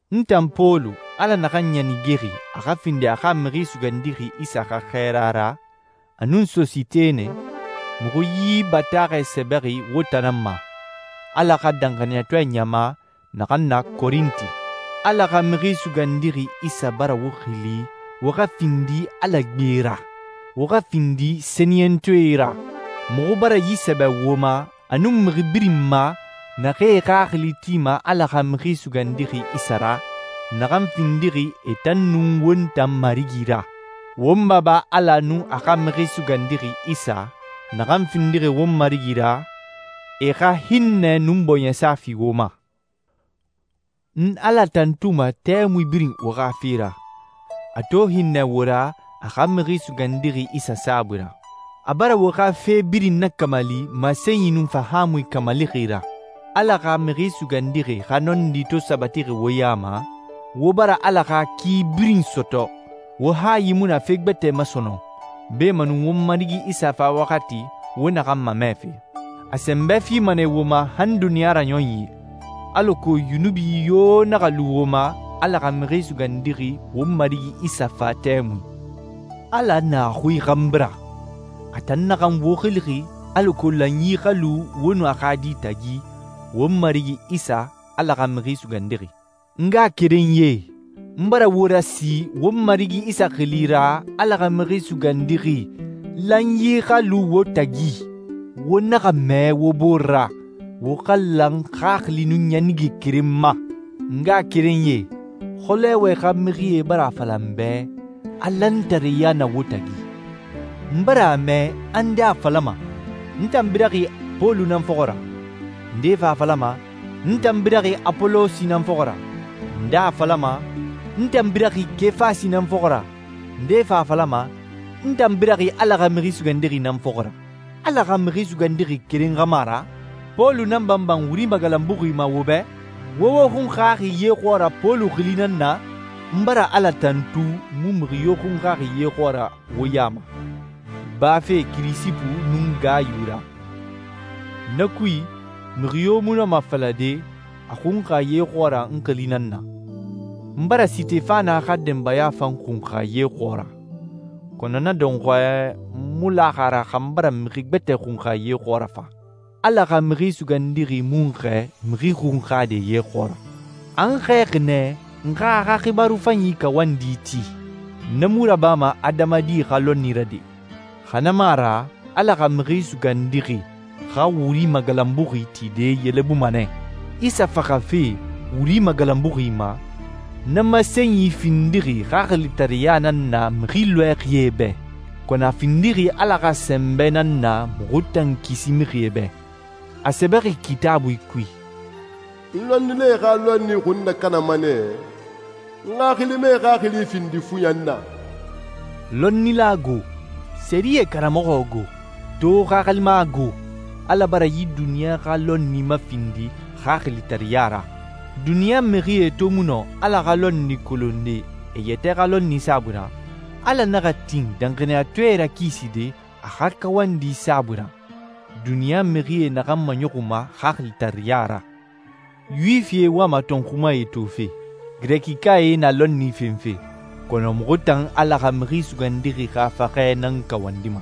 N tan Pɔlu, Ala naxan ɲanigexi a xa findi a xa Mixi Sugandixi Isa xa xɛɛra ra, a nun Sositene, muxu yi bataaxɛ sɛbɛxi wo tan nan ma, Ala xa danxaniyatɔɛ ɲama, naxan na Korinti. Ala xa Mixi Sugandixi Isa bara wo xili wo xa findi Ala gbe ra, wo xa findi sɛniyɛntɔɛe ra. Muxu bara yi sɛbɛ wo ma, a nun mixi birin ma naxee e xaxili tima Ala xa Mixi Sugandixi Isa ra, naxan findixi e tan nun won tan Marigi ra. Won Baba Ala nun a xa Mixi Sugandixi Isa, naxan findixi won Marigi ra, e xa hinnɛ nun bɔɲɛsa fi wo ma. N Ala tantuma tɛmui birin wo xa fe ra, a to hinnɛ wo ra a xa Mixi Sugandixi Isa saabui ra. A bara wo xa fe birin nakamali masenyi nun fahaamui kamalixi ra. Ala xa Mixi Sugandixi xa nɔndi to sabatixi wo ya ma, wo bara Ala xa ki birin sɔtɔ, wo hayi mu na fe gbɛtɛ ma sɔnɔn, beemanu won Marigi Isa fa waxati wo naxan mamɛfe. A sɛnbɛ fima nɛ wo ma han duniɲa raɲɔnyi, alako yunubi yo naxa lu wo ma Ala xa Mixi Sugandixi won Marigi Isa fa tɛmui. Ala na a xui xanbi ra, a tan naxan wo xilixi alako lanyi xa lu wo nun a xa Di tagi, won Marigi Isa, Ala xa Mixi Sugandixi. N ngaxakerenyie, n bara wo rasi won Marigi Isa xili ra, Ala xa Mixi Sugandixi, lanyi xa lu wo tagi. Wo naxa mɛɛ wo bore ra, wo xa lan xaxili nun ɲanige keren ma. N ngaxakerenyie, Xolowe xa mixie bara a fala n bɛ, a lantareya na wo tagi. N bara a mɛ a nde a falama, «N tan biraxi Pɔlu nan fɔxɔ ra,» nde fan a falama, «N tan biraxi Apolosi nan fɔxɔ ra,» nde a falama, «N tan biraxi Kefasi nan fɔxɔ ra,» a nde fan a falama, «N tan biraxi Ala xa Mixi Sugandixi nan fɔxɔ ra.» Ala xa Mixi Sugandixi keren xa mu a ra? Pɔlu nan banban wuri magalanbuxi ma wo bɛ? Wo wo xunxaxi ye xɔɔra Pɔlu xili nan na? N bara Ala tantu n mu mixi yo xunxaxi ye xɔɔra wo ya ma, bafe Kirisipu nun Gayu ra. Na kui, mixi yo mu nɔma a falade a xunxa ye xɔɔra n xili nan na. N bara Sitefana xa denbaya fan xunxa ye xɔɔra, kɔnɔ na dɔnxɔɛ, n mu laxi a ra xa n bara mixi gbɛtɛ xunxa ye xɔɔra fa. Ala xa Mixi Sugandixi mu n xɛɛ mixi xunxade ye xɔɔra. A n xɛɛxi nɛ n xa a xa xibaaru fanyi kawandi ti. Na mu rabama adamadi xa lɔnni ra de, xa na mu a ra Ala xa Mixi Sugandixi xa wuri magalanbuxi tide yelebuma nɛ. Isa faxafe wuri magalanbuxi ma, na masenyi findixi xaxilitareɲa nan na mixi lɔɛxie bɛ, kɔnɔ a findixi Ala xa sɛnbɛ nan na muxu tan kisi mixie bɛ. A sɛbɛxi Kitaabui kui, «N lɔnnilae xa lɔnni xun nakanama nɛ, n xaxilimae xaxili findi fuyan na.» Lɔnnila go? Sɛriyɛ karamɔxɔ go? To xaxilima go? Ala bara yi duniɲa xa lɔnni mafindi xaxilitareɲa ra. Duniɲa mixie to mu nɔ Ala xa lɔnni kolonde e yɛtɛ xa lɔnni saabui ra, Ala naxa tin danxaniyatɔɛe rakiside a xa kawandi saabui ra, duniɲa mixie naxan maɲɔxunma xaxilitareɲa ra. Yuwifie wama tɔnxumae tofe, Girɛkikae na lɔnni fenfe, kɔnɔ muxu tan Ala xa Mixi Sugandixi xa faxɛ nan kawandima.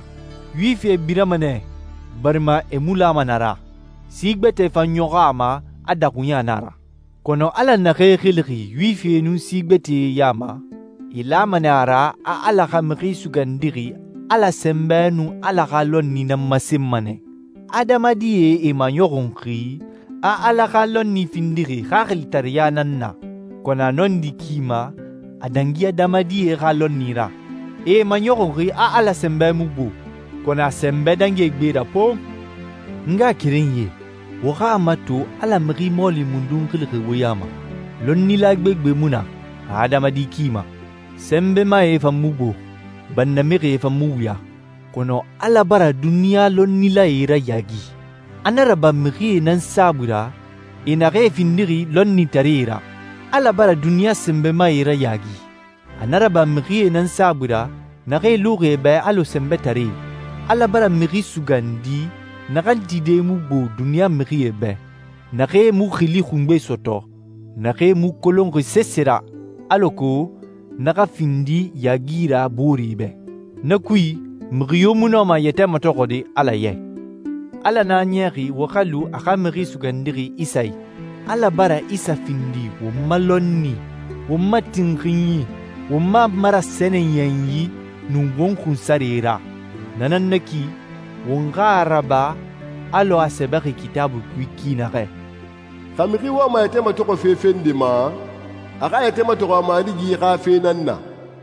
Yuwifie birama nɛ barima e mu lama na ra, si gbɛtɛe fan ɲɔxɔ a ma a daxuɲa na a ra. Kɔnɔ Ala naxee xilixi Yuwifie nun si gbɛtɛe ya ma, e lama nɛ a ra a Ala xa Mixi Sugandixi Ala sɛnbɛ nun Ala xa lɔnni nan masenma nɛ. Adamadie e maɲɔxunxi a Ala xa lɔnni findixi xaxilitareɲa nan na, kɔnɔ a nɔndi ki ma a dangi adamadie xa lɔnni ra. E maɲɔxunxi a Ala sɛnbɛ mu gbo, kɔnɔ a sɛnbɛ dangi e gbe ra pon! N ngaxakerenyie, wo xa a mato Ala mixi mɔɔli mundun xilixi wo ya ma. Lɔnnila gbegbe mu na, adamadi ki ma. Sɛnbɛmae fan mu gbo. Bannamixie fan mu wuya. Kɔnɔ Ala bara duniɲa lɔnnilae rayaagi. A na raba mixie nan saabui ra, e naxee findixi lɔnnitaree ra. Ala bara duniɲa sɛnbɛmae rayaagi. A na raba mixie nan saabui ra, naxee luxi e bɛ alɔ sɛnbɛtaree. Ala bara mixi sugandi, naxan tide mu gbo duniɲa mixie bɛ, naxee mu xili xungbe sɔtɔ, naxee mu kolonxi sese ra, alako na xa findi yaagi ra booree bɛ. Na kui, mixi yo mu nɔma a yɛtɛ matɔxɔde Ala ya i. Ala nan a niyaxi wo xa lu a xa Mixi Sugandixi Isa i. Ala bara Isa findi won ma lɔnni, won ma tinxinyi, won ma marasɛniyɛnyi, nun won xunsare ra. Na nan na ki, won xa a raba alɔ a sɛbɛxi Kitaabui kui ki naxɛ, «Xa mixi wama a yɛtɛ matɔxɔfe fe nde ma, a xa a yɛtɛ matɔxɔ a Marigi xa fe nan na.»